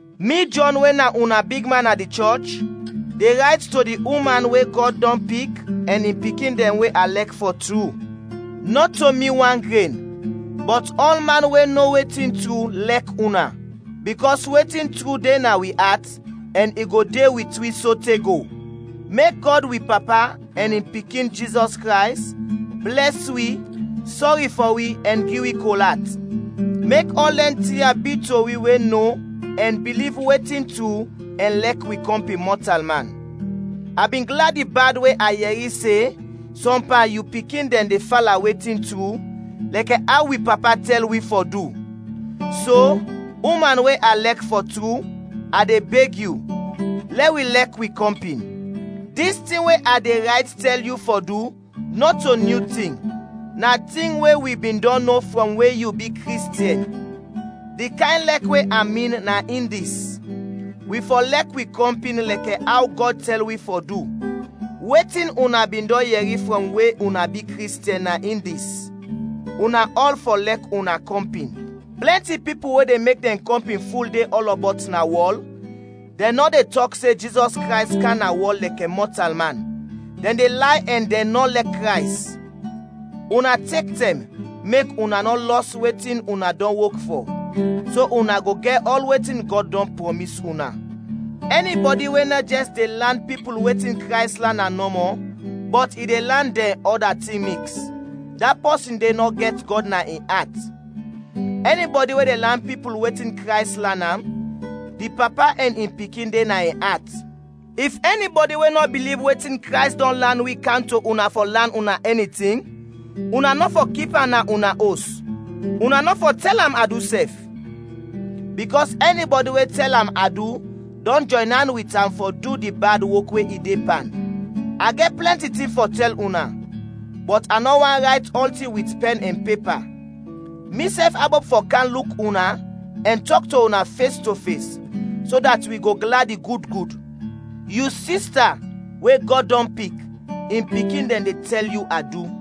Mi, Jɔn we na una bigman na di chɔch, de rayt to di uman we Gɔd dɔn pik ɛn in pikin dɛn we a lɛk fɔ tru. Nɔto mi wan gren, bɔt ɔlman we no wetin tru, lɛk una, bikɔs wetin tru de na wi at ɛn i go de wit wi sote go. Mek Gɔd wi Papa, ɛn in Pikin, Jizɔs Krays, blɛs wi, sɔri fɔ wi, ɛn gi wi kol at; mek ɔl dɛn tin ya bi to wi we no ɛn biliv wetin tru ɛn lɛk wi kɔmpin mɔtalman. A bin gladi bad we a yɛri se sɔm pan yu pikin dɛn de fala wetin tru, lɛkɛ aw wi Papa tɛl wi fɔ du. So, uman we a lɛk fɔ tru, a de beg yu: lɛ wi lɛk wi kɔmpin. Dis tin we a de rayt tɛl yu fɔ du, nɔto nyu tin; na tin we wi bin dɔn no frɔm we yu bi Kristiɛn. Di kayn lɛk we a min na in dis: Wi fɔ lɛk wi kɔmpin lɛkɛ aw Gɔd tɛl wi fɔ du. Wetin una bin dɔn yɛri frɔm we una bi Kristiɛn na in dis: Una ɔl fɔ lɛk una kɔmpin. Plɛnti pipul we de mek dɛn kɔmpin ful de ɔlɔbɔt na wɔl, dɛn nɔ de tɔk se Jizɔs Krays kam na wɔl lɛkɛ mɔtalman; dɛn de lay ɛn dɛn nɔ lɛk Krays. Una tek tɛm, mek una nɔ lɔs wetin una dɔn wok fɔ, so una go gɛt ɔl wetin Gɔd dɔn prɔmis una. Ɛnibɔdi we nɔ jɛs de lan pipul wetin Krays lan am nɔmɔ, bɔt i de lan dɛn ɔda tin miks, da pɔsin de nɔ gɛt Gɔd na in at. Ɛnibɔdi we de lan pipul wetin Krays lan am, di Papa ɛn in Pikin de na in at. If ɛnibɔdi we nɔ biliv wetin Krays dɔn lan wi, kam to una fɔ lan una ɛni tin, una nɔ fɔ kip am na una os; una nɔ fɔ tɛl am adu sɛf. Bikɔs ɛnibɔdi we tɛl am adu dɔn jɔyn an wit am fɔ du di bad wok we i de pan. A gɛt plɛnti tin fɔ tɛl una, bɔt a nɔ want rayt ɔltin wit pɛn ɛn pepa; misɛf abop fɔ kam luk una ɛn tɔk to una fes to fes, so dat wi go gladi gud gud. Yu sista, we Gɔd dɔn pik, in pikin dɛn de tɛl yu adu.